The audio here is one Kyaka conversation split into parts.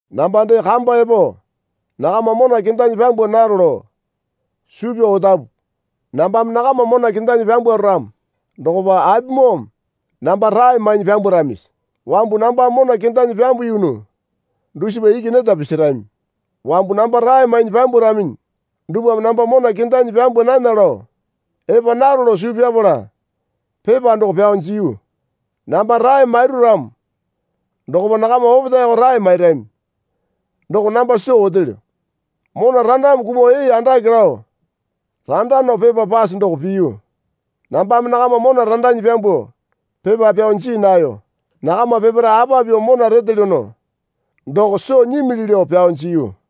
Namba dee kamba epo nakama mona kendanyi pyambwa naro lao suu pyao otapu. Nambame nakama mona kendanyi pyambwaro ramo dokopa apimoome namba rae mainyi pyambwaramisi? Wambu nambame mona kendanyi pyambuyunu dusipa iki neta pisirami. Wambu namba rae mainyi pyambwaraminyi dupwame namba mona kendanyi pyambwa nana lao epa naro lao suu pyapala pepa doko pyao jiyu. Namba rae mairu ramo dokopa nakama opetaeko rae mairami doko namba soo otelyo. Mona randame kumuo ee andake lao randa nao pepa pase doko piyu. Nambame nakama mona randanyi pyambuo pepa pyao jii nayo. Nakama peparae apa pyuo mona retelyono doko soo nyimili lao pyao jiyu.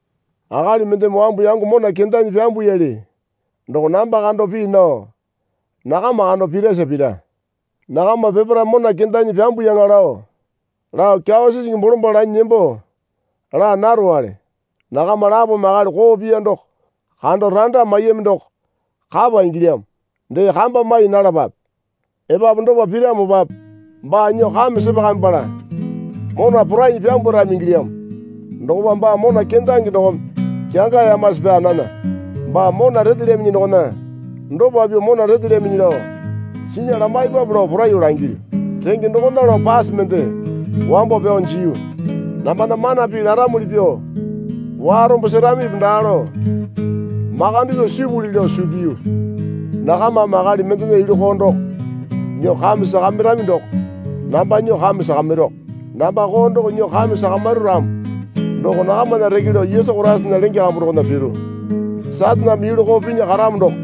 Akali mendeme wambu yango mona kendanyi pyambuyali doko namba kando pii nao nakama kando pirasa pira. Nakama peparae mona kendanyi pyambuyaŋa lao lao kyawa sisingi bolombalo lanyi nembo laa narowale. Nakama lapome akali koo piya doko kando randa maiyami doko kapa ingilyamo. Dee kamba mai nalapape. Epapu dopa piramopape baa nyuo kame sepakamipala mona porainyi pyambwarami ingilyamo. Dokopa baa mona kendange dokome kyangayamasi pyaa nana. Baa mona retelyaminyi dokona dopa pyuo mona retelyaminyi lao sinya lamaipape lao poraiyuo langilyu. Renge dokona lao pase mende wambo pyao jiyu. Nambana mana pii laramuli pyuo warombo seramipi daa lao makande pyuo sipuli lao suu piyu. Nakamame akali mendena yulu koo doko nyuo kame sakamiramo doko namba nyuo kame sakamiruko. Namba koo doko nyuo kame sakamiru ramo doko nakamana reke lao Yesu Koraisana lenge kambu dokona piru. Sataneme yulu koo pinya karamo doko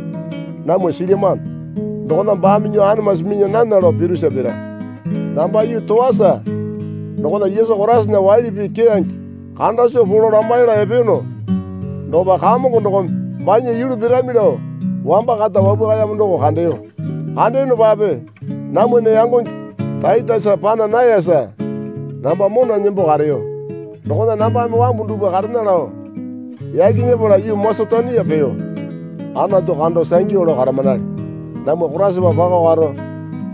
namwa silyamano. Dokona baame nyuo anamasi minya nana lao pirusa pira. Namba yuu Toasa dokona Yesu Koraisana waili pii keyange kanda soo polo lamaila epeyono dokopa Kamongo dokome banya yulu pirami lao wamba kata wapwakayamo doko kandeyo. Kandeyonopape namwana yangonge Taitesa pana nayasa namba mona nembo kareyo. Dokona nambame wambu dupwa karena lao yaki nyepala yuu Masetonia peyo. Anatu kando sangyu lao karamanale. Namwa Koraisapa pako karo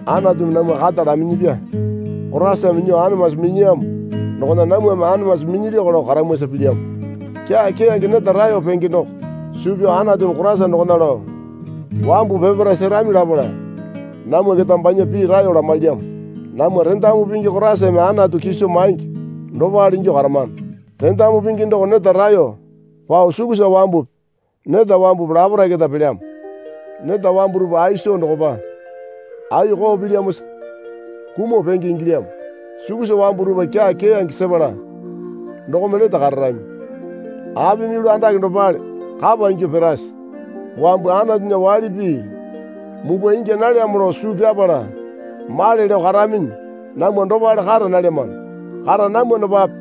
Anatumi namwa kata laminyipya Koraisame nyuo anamasi minyiyamo dokona namwame anamasi minyilyako lao karamwasa pilyamo. Kyaa keyange neta raeyo penge doko suu pyao Anatumi Koraisa dokona lao wambu peparae serami lapala namwa keta banya pii raeyo lamailyamo. Namwa rendamu pingi Koraisame Anatu kiso maingi dopale ingyuo karamano. Rendamu pingi doko neta raeyo pao sukusa wambupi neta wambupi laparae keta pelyamo. Neta wambu dupwa ai soo dokopa ai koo pilyamosa kumuo penge ingilyamo. Sukusa wambu dupwa kyaa keyange sepala dokome lete kararami. Apimi yulu andake dopale kapa ingyuo pirase? Wambu Anatunya waili pii mupwa ingya nalyamo lao suu pyapala male lao karaminyi namwa dopale kara nalyamano. Kara namwanopape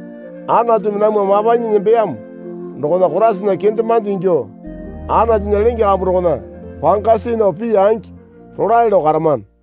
Anatumi namwa mapanyi nembeyamo dokona Koraisana kendemande ingyuo Anatunya lenge kambu dokona panga see nao pii angi rolae lao karamano.